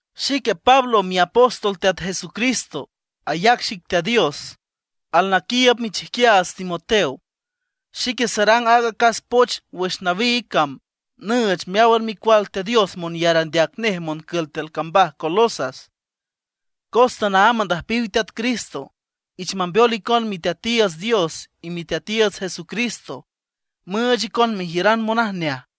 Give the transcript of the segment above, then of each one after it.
Xique Pablo miapóstol Teat Jesucristo, ayac xic Teat Dios. Alnaquiiüb michijquiaats Timoteo. Xique sarang aaga acas poch wüx nawiig cam nüüch meáwan micual Teat Dios monyar andeac nej moncül tiül cambaj Colosas, cos tanaámb andüjpiw Teat Cristo. Ich mambeol icon Miteatiiüts Dios y Miteatiiüts Jesucristo, müüch icon mejiüran monajneaj.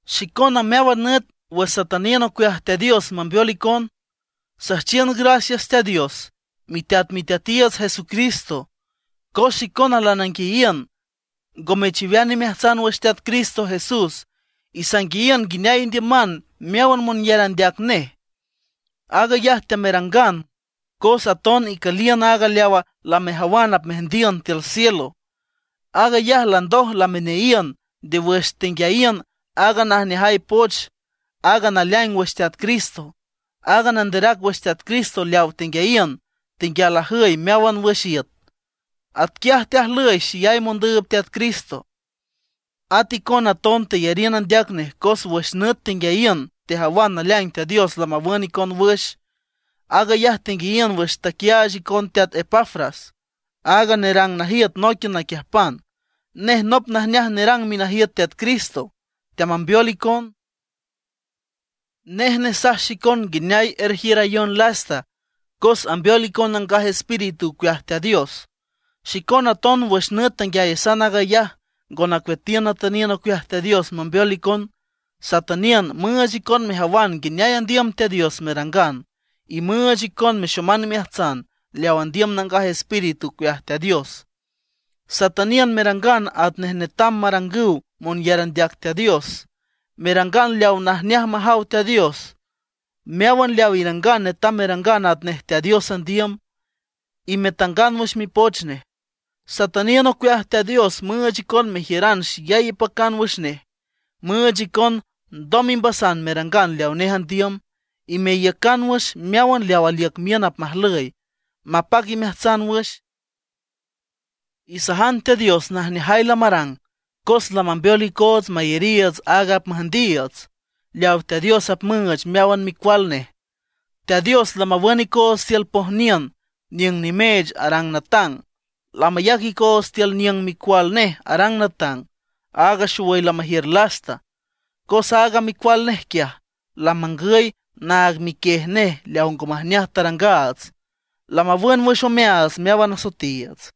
Xicona meáwan nüt wüx satüniün ocueaj Teat Dios mambeol icona, süjchiün gracias Teat Dios, miteat Miteatiiüts Jesucristo. Cos xicona lananguiayiün ngo mechiwean imeajtsan wüx Teat Cristo Jesús, y sanguiayiün nguineay indiüman meáwan monyar andeac nej. Aag ayaj teamerangan cos aton icüliün aaga leawa lamejawan apmeajndiün tiül cielo. Aag ayaj landoj lameneayiün nde wüx tenguiayiün aaga najneajay poch, aaga naleaing wüx Teat Cristo. Aaga nanderac wüx Teat Cristo leawa tenguiayiün, tenguial ajüy meáwan wüx iüt. Atquiaj teajlüy xeyay mondüüb Teat Cristo. At icona aton teyariün andeac nej, cos wüx nüt tenguiayiün tejawan naleaing Teat Dios lamawün icon wüx. Aag ayaj tenguiayiün wüx taquiaach icon teat Epafras, aaga nerang najiüt nóiquian naquiüjpan. Nej nop najneaj nerang minajiüt Teat Cristo, teamambeol icon. Nej nesaj xicon nguineay erjiürayon lasta, cos ambeol icon Nangaj Espíritu ocueaj Teat Dios. Xicona aton wüx nüt tanguiayasan aag ayaj, ngo nacueatiün natüniün ocueaj Teat Dios mambeol icon. Satüniün müüch icon mejawan nguineay andiüm Teat Dios merangan; y müüch icon mexoman imeajtsan leaw andiüm Nangaj Espíritu ocueaj Teat Dios. Satüniün merangan atnej netam marangüw monyar andeac Teat Dios, merangan leawa najneaj majaw Teat Dios. Meáwan leaw irangan netam merangan atnej Teat Dios andiüm, y metangan wüx Mipoch nej. Satüniün ocueaj Teat Dios müüch icon mejiüran xeyay ipacan wüx nej, müüch icon ndoj imbasan merangan leawa nej andiüm, y meiücan wüx meáwan leaw aliüc miün apmajlüy, mapac imeajtsan wüx. Isajan Teat Dios najneajay lamarang cos lamambeol icoots mayariiüts aaga apmüjndiiüts, leaw Teat Dios apmüüch meáwan micual nej. Teat Dios lamawün icoots tiül pojniün niüng nimeech arang natang; lamayac icoots tiül niüng Micual nej arang natang, áag xowüy lamajiür lasta. Cos aaga Micual nej quiaj, lamangüy naag miquiej nej leaw ngo majneaj tarangaats, lamawün wüx omeaats meáwan asoetiiüts.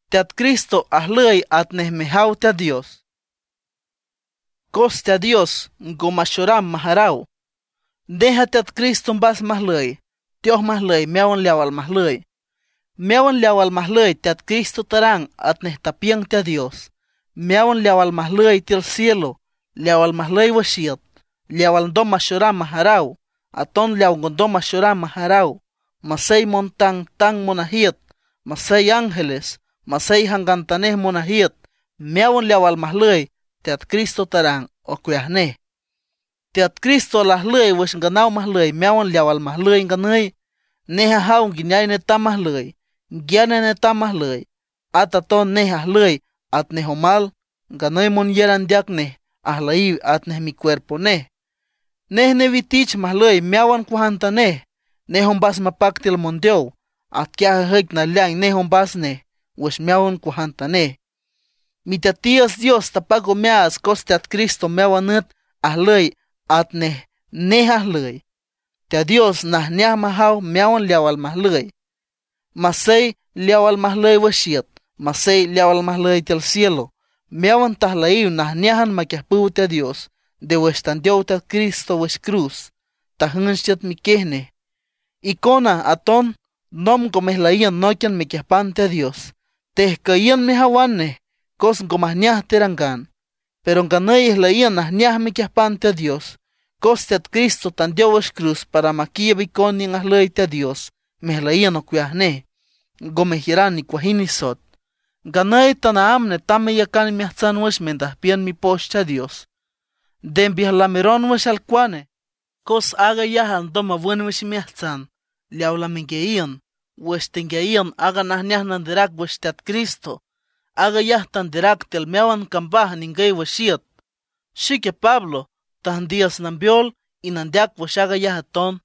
Teat Cristo ajlüy atnej mejaw Teat Dios, cos Teat Dios ngo maxoram majaraw. Nej a Teat Cristo mbas majlüy, teoj majlüy meáwan leaw almajlüy. Meáwan leaw almajlüy, Teat Cristo tarang atnej tapiüng Teat Dios, meáwan leaw almajlüy tiül cielo, leaw almajlüy wüx iüt, leaw alndom maxoram majaraw, aton leawa ngondom maxoram majaraw; masey montangtang monajiüt, masey ángeles, masey jangantanej monajiüt. Meáwan leaw almajlüy, Teat Cristo tarang ocueaj nej. Teat Cristo lajlüy wüx nganaw majlüy meáwan leaw almajlüy nganüy. Nej ajaw nguineay netam majlüy, nguiane netam majlüy. At aton nej ajlüy atnej omal, nganüy monyar andeac nej ajlüyiw atnej micuerpo nej. Nej newitich majlüy meáwan cuajantanej. Nej ombas mapac tiül mondeow, atquiaj ajüic naleaing nej ombas nej wüx meáwan cuajantanej. Miteatiiüts Dios tapac omeaats cos Teat Cristo meáwan nüt ajlüy atnej nej ajlüy. Teat Dios najneaj majaw meáwan leaw almajlüy, masey leawa almajlüy wüx iüt, masey leawa almajlüy tiül cielo. Meáwan tajlüyiw najneájan maquiüjpüw Teat Dios nde wüx tandeow Teat Cristo wüx cruz, tajünch tiüt miquiej nej. Icona aton nomb ngo mejlüyiün nóiquian mequiüjpan Teat Dios. Tejcüyiün mejawan nej cos ngo majneaj terangan; pero nganüy ijlüyiün najneaj mequiüjpan Teat Dios, cos Teat Cristo tandeow wüx cruz para maquiiüb icon niüng ajlüy Teat Dios mejlüyiün ocueaj nej, ngo mejiüran nicuajind nisoet. Nganüy tanaámb netam meyacan imeajtsan wüx indüjpiün Mipoch Teat Dios. Nde mbiüjlameron wüx alcuane, cos aag ayaj alndom mawün wüx imeajtsan leawa lamenguiayiün wüx tenguiayiün aaga najneaj nanderac wüx Teat Cristo. Aag ayaj teanderac tiül meáwan cambaj ningüy wüx iüt. Xique Pablo tüjndiüs nambeol y nandeac wüx aag ayaj aton.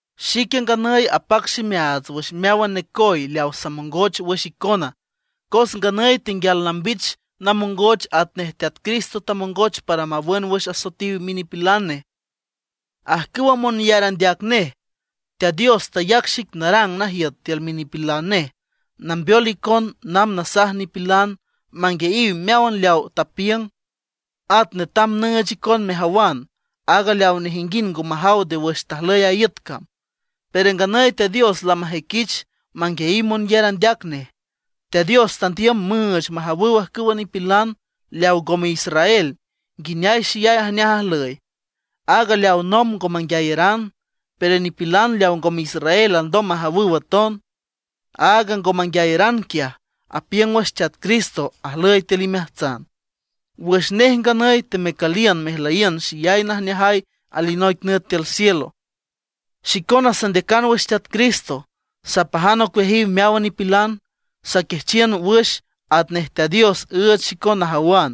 Xique nganüy apac ximeaats wüx meáwan necoy leaw samongoch wüx icona, cos nganüy tenguial nambich namongoch atnej Teat Cristo tamongoch para mawün wüx asoetiw minipilan nej, ajcüwa monyar andeac nej. Teat Dios tayac xic narang najiüt tiül minipilan nej, nambeol icon namb nasaj nipilan manguiayiw meáwan leawa tapiüng. At netam nüüch icon mejawan aaga leaw nejinguind ngo majaw nde wüx tajlüy aaga iüt cam. Pero nganüy Teat Dios lamajüiquich manguiayiw monyar andeac nej. Teat Dios tandiüm müüch majawüw ajcüwa nipilan leaw ngome israel nguineay xeyay ajneaj ajlüy áag leawa nomb ngo manguiayaran. Pero nipilan leaw ngome israel alndom majawüw aton. Aaga ngo manguiayaran quiaj, apiüng wüx Teat Cristo ajlüy tiül imeajtsan, wüx nej nganüy temecüliün mejlüyiün xeyay najneajay alinoic nüt tiül cielo. Xicona sandeacan wüx Teat Cristo, sapajan ocueajiw meáwan nipilan, saquiajchiün wüx atnej Teat Dios üüch xicon najawan,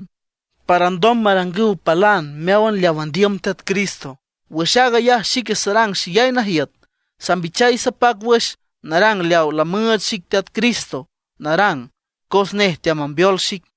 para alndom marangüw palan meáwan leaw andiüm Teat Cristo. Wüx aag ayaj xique sarang xeyay najiüt, sambichay sapac wüx narang leaw lamüüch xic Teat Cristo narang, cos nej teamambeol xic.